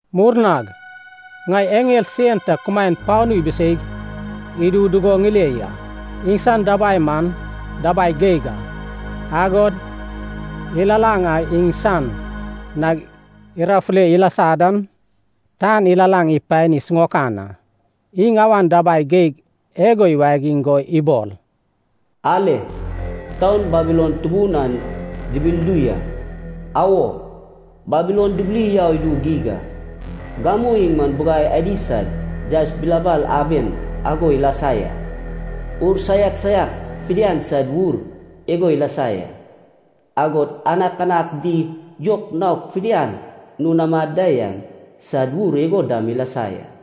Murnag ŋai eŋel sen ta kumaen panu ibiseig idu dugo ŋile ya. Iŋsan dabai man dabai geig a, agod ilalaŋ a iŋsan nag irafule ilasa dan, tan ilalaŋ ipani siŋaokan a. Iŋ awan dabai geig igo iwagiŋ go ibol, “Ale, taun Babilon tubun an dibildu ya, awo, Babilon dibili yau idu geig a. Gamu iŋ man bugai adi sad yaes bilabal aben ago ilasa ya, ur saiak saiak fidian sad wur igo ilasa ya, agod anakanak di yok naok fidian nun amad da yan sad wur igo dam ilasa ya.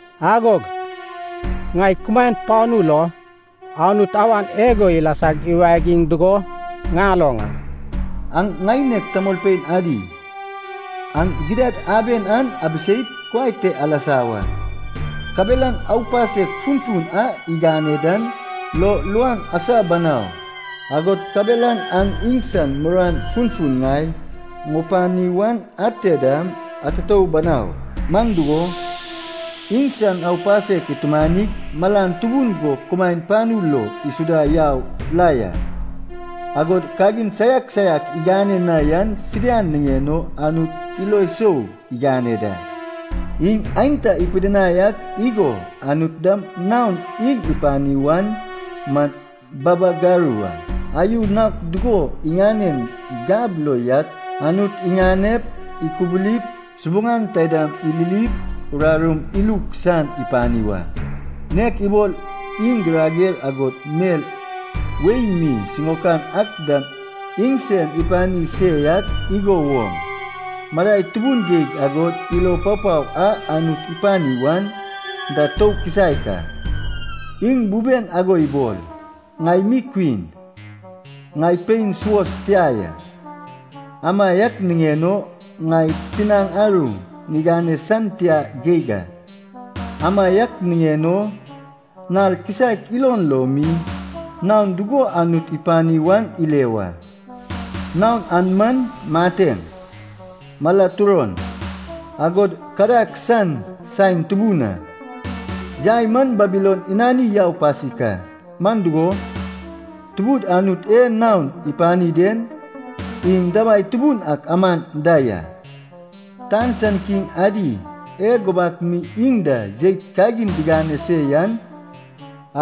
Agog ŋai kumaen panu lo Anut awan igo ilasag iwagiŋ dugo ŋaloŋ a. “Aŋ ŋaineg tamolpein adi, aŋ gidad aben an abiseip kuai te alasa wa. Kabelan aupasek funfun a igane dan lo luan asa banau. Agod kabelan aŋ iŋsan muruan funfun ŋai ŋupani wan ate dam atutou banau. Man dugo, iŋsan aupasek itumanig malan tubun go kumaen panu lo isuda yau la ya. Agod kagin saiak saiak igane na yan fidian niŋen o Anut ilo sou igane da. Iŋ aenta ipidinai ak igo Anut dam naon iŋ ipani wan man babagaru a. Ayu naok dugo iŋanen gab lo yak Anut iŋanep, ikubulip, subuŋan taidam ililip, urarum iluk san ipani wa. Nek ibol iŋ girager agod mel wei mi siŋaokan ak dam iŋsen ipani se yak igo woŋ, madai tubun geig agod ilo papao a Anut ipani wan da tou kisaek a. Iŋ buben ago ibol, ŋai mi kwin, ŋai pein suos tia ya, amaiak niŋen o ŋai tinaŋ aru ŋigane san tia geig a. Amaiak niŋen o, nal kisaek ilon lo mi, naon dugo Anut ipani wan ile wa. Naon an man mateŋ, mala turon, agod kadag san saen tubun a. Yai man Babilon inani yau pasik a. Man dugo, Tubud Anut e naon ipani den, iŋ dabai tubun ak aman da ya. “Tan san kiŋ adi e gubak mi iŋ da jeit kagin digane se yan,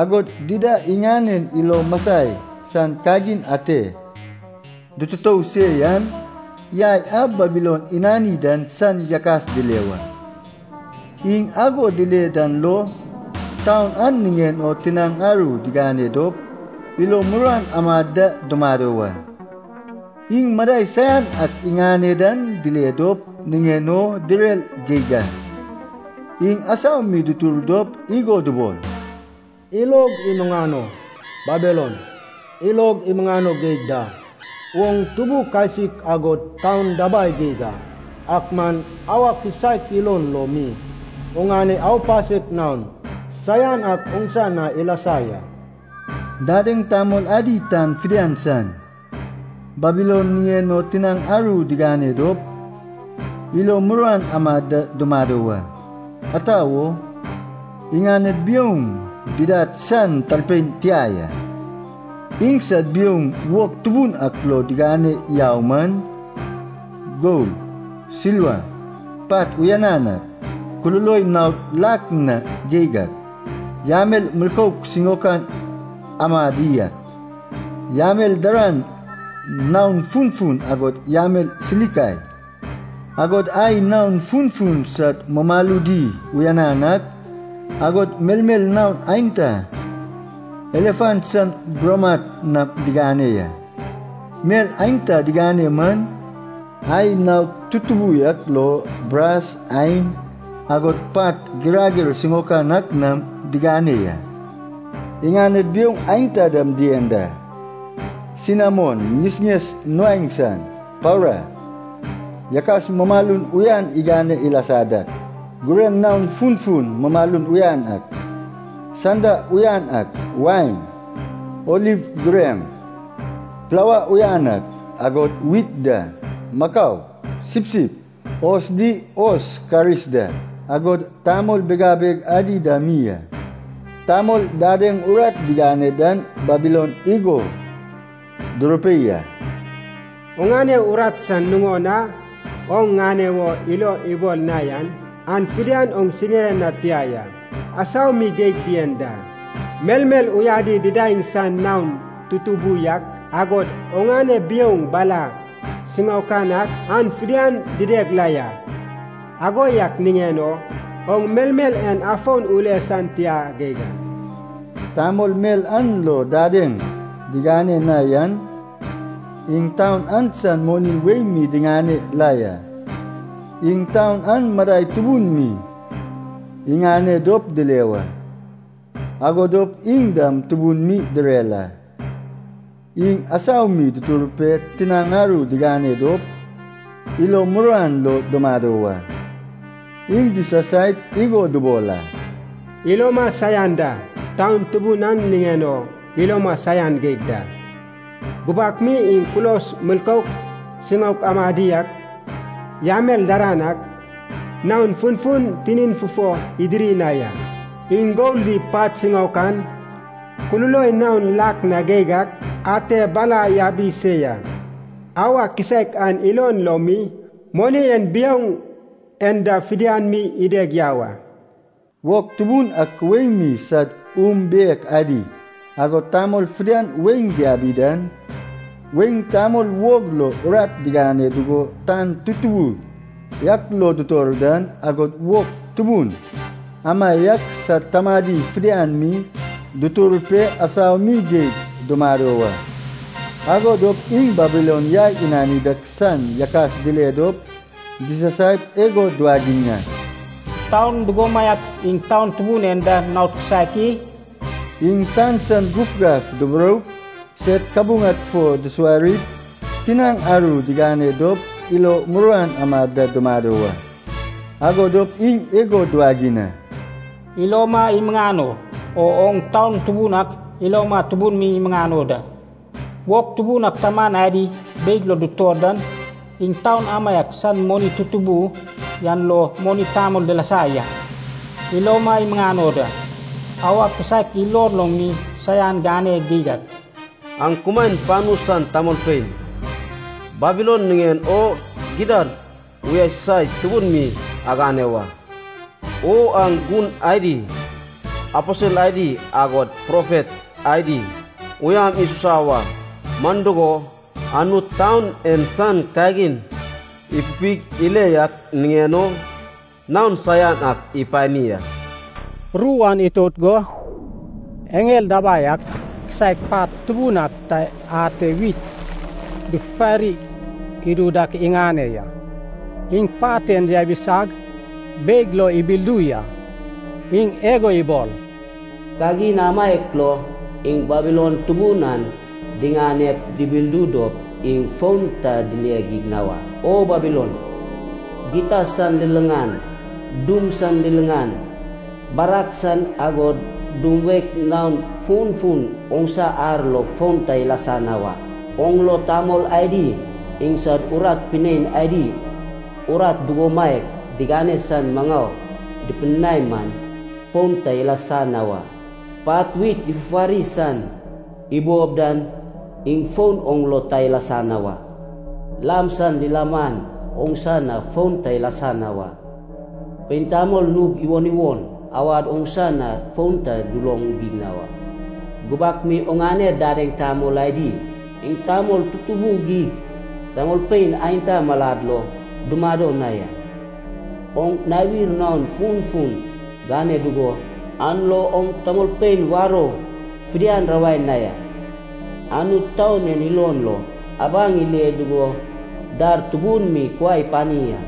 agod dida iŋanen ilo masai san kagin ate dututou se yan, yai a Babilon inani dan san yakas dile wa. Iŋ ago dile dan lo, taun an niŋen o tinaŋ aru digane dop ilo muruan amad da dumado wa. Iŋ madai saian ak iŋane dan dile dop niŋen o direr geig a. Iŋ asau mi dutur dop igo dubol, ‘Ilog imuŋano, Babilon, ilog imuŋano geig da. Oŋ tubu kasik agod taun dabai geig a. Ak man auwa kisaek ilon lo mi oŋane aupasek naon saian ak oŋsa na ilasa ya!’ “Dadeŋ tamol adi tan fidian san, Babilon niŋen o tinaŋ aru digane dop, ilo muruan amad da dumado wa. Ata wo, iŋaned biouŋ didad san talpein tia ya. Iŋsad biouŋ wog tubun ak lo digane yau man, gol, silva, pat uyanan ak, kululoi naod lak na geig ak, yamel milkouk siŋaok amadi ak, yamel daran naon funfun agod yamel silika. Agod ai naon funfun sad mumaludi uyanan ak, agod melmel naon aenta elefan san buramat nam digane ya. Mel aenta digane man, ai naod tutubu yak lo, bras, ain, agod pat girager siŋaokan ak nam digane ya. Iŋaned biouŋ aenta dam dien da. Sinamon ŋesŋes nuaeŋ san, paura, yakas mumalun uyanan igane ilasa dak, gureŋ naon funfun mumalun uyan ak, sanda uyan ak, wain, oliv gureŋ, plaua uyan ak, agod wit da, makau, sipsip, hos di hos karis da, agod tamol bigabeg adi dam mi a. “Tamol dadeŋ urat digane dan Babilon igo durupei a. ‘Oŋane urat san nuŋon a oŋ ŋane wo ilo ibol na yan, an fidian oŋ siŋire na tia ya, asau mi geig dien da. Melmel uyadi didaeŋ san naon tutubu yak, agod oŋane biouŋ bala siŋaokan ak an fidian dideg la ya. Ago yak niŋen o oŋ melmel en afon ule san tia geig a!’ Tamol mel an lo dadeŋ digane na yan, iŋ taun an san moni wei mi diŋane la ya. Iŋ taun an madai tubun mi iŋane dop dile wa, ago dop iŋ dam tubun mi direr a. Iŋ asau mi dutur pe tinaŋ aru digane dop, ilo muruan lo dumado wa. Iŋ disasaip igo dubol a. ‘Iloma saian da, taun tubun an niŋen o iloma saian geig da. Gubak mi iŋ kulos milkouk siŋaok amadi ak, yamel daran ak naon funfun tinin fufo idiri na ya. Iŋ gol di pat siŋaokan, kululoi naon lak na geig ak ate bala yabi se ya. Auwa kisaek an ilon lo mi, moni en iŋ biouŋ en da fidian mi ideg yau a.’ “Wog tubun ak wei mi sad unbiek adi, agod tamol fidian weiŋ diabi dan, weiŋ tamol wog lo urat digane dugo tan tutubu yak lo dutor dan, agod wog tubun amaiak sad tamadi fidian mi, dutur pe asau mi geig dumado wa. Ago dop iŋ Babilon yai inani dak san yakas dile dop disasaip igo duwagiŋ a, ‘Taun dugomaiak iŋ taun tubun en da naon kisaek i?’ Iŋ tan san gufgaf duburoup, sed kabuŋad fo dusuwarip, tinaŋ aru digane dop ilo muruan amad da dumado wa. Ago dop iŋ igo duwagiŋ a, ‘Iloma imuŋano, o oŋ taun tubun ak iloma tubun mi imuŋano da. Wog tubun ak taman adi beig lo dutor dan, iŋ taun amaiak san moni tutubu yan lo moni tamol dilasa ya. Iloma imuŋano da. Auwa kisaek ilon lo mi saian gane geig a!’ “Aŋ kumaen panu san tamolpein, Babilon niŋen o gidad uyasusai tubun mi agane wa! O aŋ gun adi, aposel adi agod profet adi uyam isusa wa. Man dugo, Anut taun en san kagin ipupig ile yak niŋen o naon saian ak ipani a.” Ru an itout go, eŋel dabai ak kisaek pat tubun ak ta ate wit dufufari idu dak iŋane ya. Iŋ pat en yabisag beig lo ibildu ya. Iŋ igo ibol, “Kagin amaiak lo iŋ Babilon tubun an diŋanep dubildu dop iŋ fon ta dile geig na wa. O Babilon, gita san liliŋan, dum san liliŋan, barag san agod dum wek naon funfun oŋsa ar lo fon ta ilasa na wa. Oŋ lo tamol adi iŋsad urat pinein adi urat dugomaiak digane san maŋau dupidinai man, fon ta ilasa na wa. Pat wit ifufari san ibob dan, iŋ fon oŋ lo ta ilasa na wa. Lam san lilaman oŋsa na fon ta ilasa na wa. Pein tamol nug iwon iwon awad oŋsa na fon ta duloŋ geig na wa. Gubak mi oŋane dadeŋ tamol adi, iŋ tamol tutubu geig tamolpein aenta malad lo dumado na ya. Oŋ nawir naon funfun gane dugo, an lo oŋ tamolpein warou fidian rawai na ya. Anut taun en ilon lo abaŋ ile dugo dar tubun mi kuai ipani a.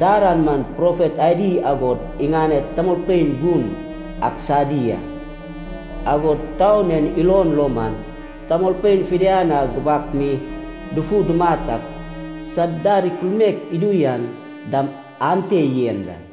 Dar an man profet adi agod iŋanen tamolpein gun ak sadi a, agod taun en ilon lo man tamolpein fidian a gubak mi dufu dumat ak sad dar ikulmaek idu yan dam ante yen da.”